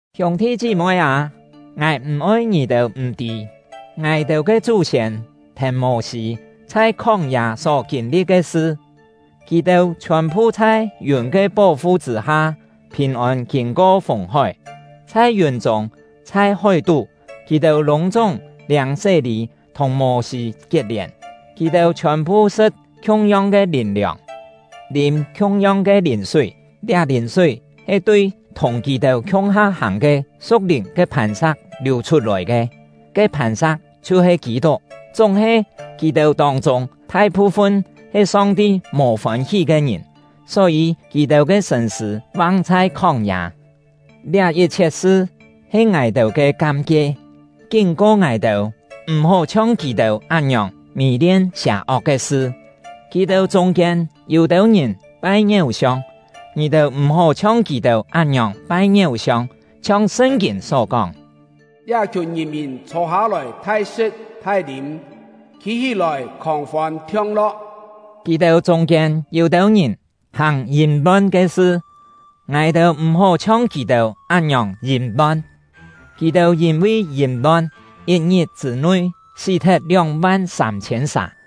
Hiûng-thi chí-moi â, ngài m̀-oi ngì-têu m̀-tî, ngài-têu ke chú-siên thèn Mô-sî chhai khóng-yâ só kîn-li̍t ke sṳ. Kì-têu chhiòn-phu chhai yùn ke pó-fu chṳ̂-ha phìn-ôn kîn-ko Fùng-hói. Chhai yùn-chûng, chhai hói-tú, kì-têu lûng-chúng liâng sé-lî thùng Mô-sî kiet-lièn. Kì-têu chhiòn-phu sṳ̍t khiung-yong ke lìn-liòng, lîm khiung-yong ke lìn-súi. Liá lìn-súi he tui thùng kì-têu khiung-ha hàng ke su̍k-lìn ke phàn-sa̍k liù chhut-lòi ke; ke phàn-sa̍k chhiu-he Kî-tuk. Chúng-he, kì-têu tông-chûng, thai-phu-fun he Song-ti mò fôn-hí ke ngìn, só-yî kì-têu ke sṳ̂n-sṳ̂ vang chhai khóng-yâ. Liá yit-chhiet sṳ he ngài-têu ke kam-kie, kín-ko ngài-têu m̀-hó chhiong kì-têu án-ngiòng mì-lien sià-ok ke sṳ. Kì-têu chûng-kiên yû-têu ngìn pai ngiéu-siong; ngì-têu m̀-hó chhiong kì-têu án-ngiòng pai ngiéu-siong. Chhiong Sṳn-kîn só kóng: “Liá-khiùn ngìn-mìn chhô-hâ-lòi thai-sṳ̍t thai-lîm, khî-hí-lòi khòng-fôn thiong-lo̍k.” Kì-têu chûng-kiên yû-têu ngìn hàng yìm-lon ke sṳ, ngài-têu m̀-hó chhiong kì-têu án-ngiòng yìm-lon; kì-têu yîn-vi yìm-lon, yit-ngit chṳ̂-nui, sí-thet lióng-van sâm-chhiên sà.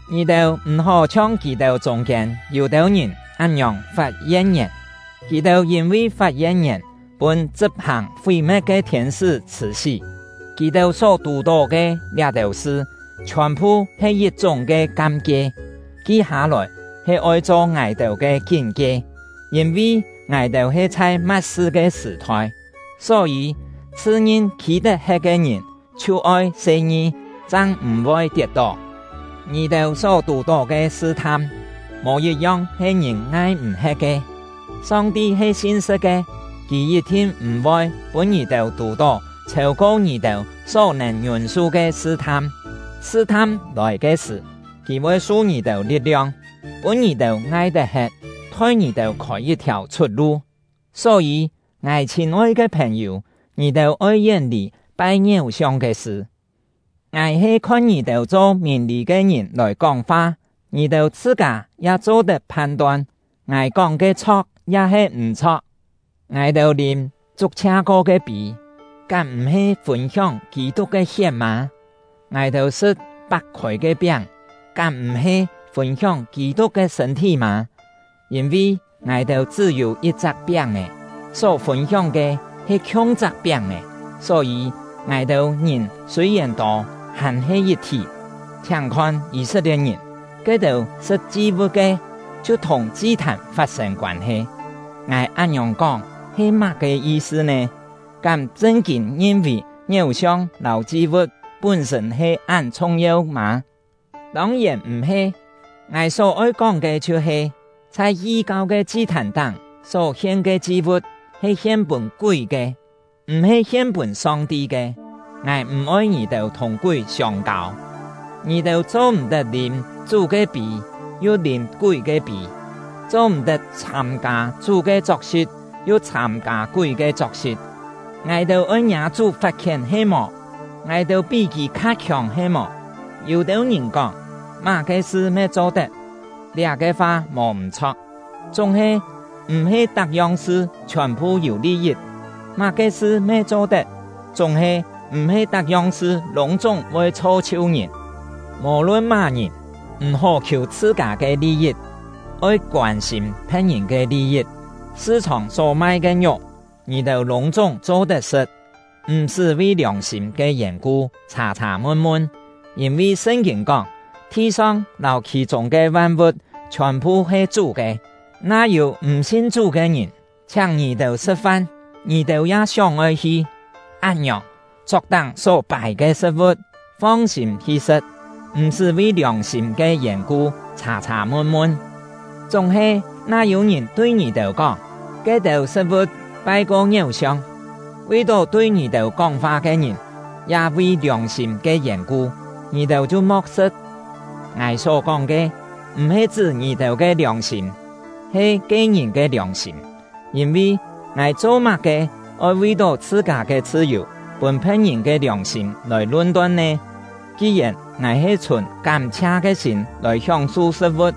Ngì-têu m̀-hó chhiong kì-têu chûng-kiên yû-têu ngìn án-ngiòng fat yen-ngièn; kì-têu yîn-vi fat yen-ngièn pûn chṳp-hàng fí-me̍t ke thiên-sṳ́ chhṳ̀-sí. Kì-têu só tù-tó ke liá-têu sṳ chhiòn-phu he yit-chúng ke kam-kie, ki hâ-lòi he oi cho ngài-têu ke kín-kie, yîn-vi ngài-têu he chhai ma̍t-sṳ ke sṳ̀-thoi. Só-yî, chhṳ-ngin khî tet-he̍t ke ngìn chhiu oi se-ngi, chang m̀-voi tiet-tó. Ngì-têu só tù-tó ke sṳ-tham, mò yit-yong he ngìn ngai-m̀-he̍t ke. Song-ti he sin-sṳ̍t ke; Kì yit-thin m̀-voi pûn ngì-têu tù-tó chhêu-ko ngì-têu só-nèn ngiûn-su ke sṳ-tham. Sṳ-tham lòi ke sṳ̀, Kì voi su ngì-têu li̍t-liong, pûn ngì-têu ngai-tet-he̍t, thoi ngì-têu khôi yit-thiàu chhut-lu. Só-yî, ngài chhîn-oi ke phèn-yû, ngì-têu oi yén-lì pai ngiéu-siong ke sṳ. Ngài he khon ngì-têu cho mìn-lî ke ngìn lòi kóng-fa; ngì-têu chhṳ-kâ ya cho-tet phan-ton, ngài kóng ke chho̍k ya-he m̀-chho̍k. Ngài-têu lîm chuk-chhia ko ke pî, kám m̀-he fûn-hióng Kî-tuk ke hiet mâ? Ngài-têu sṳ̍t pak-khôi ke piáng, kám m̀-he fûn-hióng Kî-tuk ke sṳ̂n-thí mâ? Yîn-vi ngài-têu chṳ́-yû yit-chak piáng-è, só fûn-hióng ke he khiung-chak piáng-è; só-yî, ngài-têu ngìn sûi-yèn tô, hàn-he yit-thí. Chhiáng khon Yî-set-lie̍t-ngìn; ke-têu sṳ̍t chi-vu̍t ke, chhiu thùng chi-thàn fat-sên koân-he. Ngài án-ngiòng kóng he má-ke yi-sṳ nè? Kám chṳn-kîn ngin-vì ngiéu-siong lâu chi-vu̍t pún-sṳ̂n he án chhung-yeu mâ? Tông-yèn m̀-he! Ngài só-oi kóng ke chhiu-he: Chhai yi-kau ke chi-thàn-táng só-hien ke chi-vu̍t he hien-pûn kúi ke, m̀-he hien pûn Song-ti ke. Ngài m̀-oi ngì-têu thùng kúi siông-kâu. Ngì-têu cho-m̀-tet lîm Chú ke pî yu lîm kúi ke pî, cho-m̀-tet chhâm-kâ Chú ke chok-si̍t yu chhâm-kâ kúi ke chok-si̍t. Ngài-têu oi ngiâ Chú fat-khién he-mò? Ngài-têu pí Kì kha khiòng he-mò? Yû-têu ngìn kóng: “Má-ke sṳ me cho-tet.” Liá-ke fa mò m̀-chho̍k. Chúng-he, m̀-he tak-yong sṳ chhiòn-phu yû li-yit. “Má-ke sṳ me cho-tet.” Chúng-he, m̀-he tak-yong sṳ lûng-chúng voi chho-chhiu ngìn. Mò-lun má-ngìn, m̀-hó khiù chhṳ-kâ ke li-yit, oi koân-sîm phe̍t-ngìn ke li-yit. Sṳ-chhòng só mai ke ngiuk, ngì-têu lûng-chúng cho-tet sṳ̍t, m̀-sṳ́ vi liòng-sîm ke yèn-ku chhà-chhà mun-mun. Yîn-vi Sṳn-kîn kóng: “Thi-song lâu khì-chûng ke van-vu̍t chhiòn-phu he Chú ke.” Na yû m̀-sin Chú ke ngìn chhiáng ngì-têu sṳ̍t-fan, ngì-têu ya sióng-oi hi, án-ngiòng, chok-táng só pài ke sṳ̍t-vu̍t, fong-sîm hi sṳ̍t, m̀-sṳ́ vi liòng-sîm ke yèn-ku chhà-chhà mun-mun. Chúng-he, na yû-ngìn tui ngì-têu kóng, “Ke-têu sṳ̍t-vu̍t pai-ko ngiéu-siong”, vi-tó tui ngì-têu kóng-fa ke ngìn, ya vi liòng-sîm ke yèn-ku, ngì-têu chhiu mo̍k sṳ̍t. Ngài só-kóng ke, m̀-he chṳ́ ngì-têu ke liòng-sîm, he ke-ngìn ke liòng-sîm. Yîn-vi, ngài cho-má-ke oi vi-tó chhṳ-kâ ke chhṳ-yù pûn phe̍t-ngìn ke liòng-sîm lòi lun-ton nè? Ki-yèn ngài he chhùn kám-chhia ke sîm lòi hióng-su sṳ̍t-vu̍t,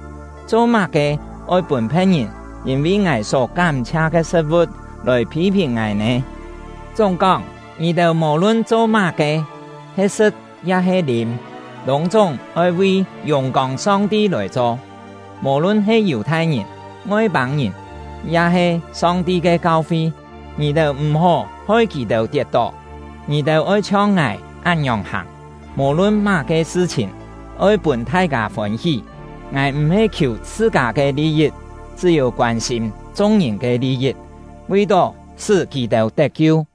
cho-má-ke oi pûn phe̍t-ngìn yîn-vi ngài só kám-chhia ke sṳ̍t-vu̍t lòi phî-phìn ngài nè? Chúng-kóng, ngì-têu mò-lun cho má-ke, he sṳ̍t ya-he lîm, lûng-chúng oi vi yùng-kông Song-ti lòi cho. Mò-lun he Yù-thai-ngìn, Ngoi-pâng-ngìn, ya-he Song-ti ke kau-fi, ngì-têu m̀-hó hoi kì-têu tiet-tó. Ngì-têu oi chhiong ngài án-ngiòng hàng, mò-lun má-ke sṳ-chhìn, oi pûn thai-kâ fôn-hí; ngài m̀-he khiù chhṳ-kâ ke li-yit, chṳ́-yû koân-sîm chung-ngìn ke li-yit, vi-tó sṳ́ kì-têu tet-kiu.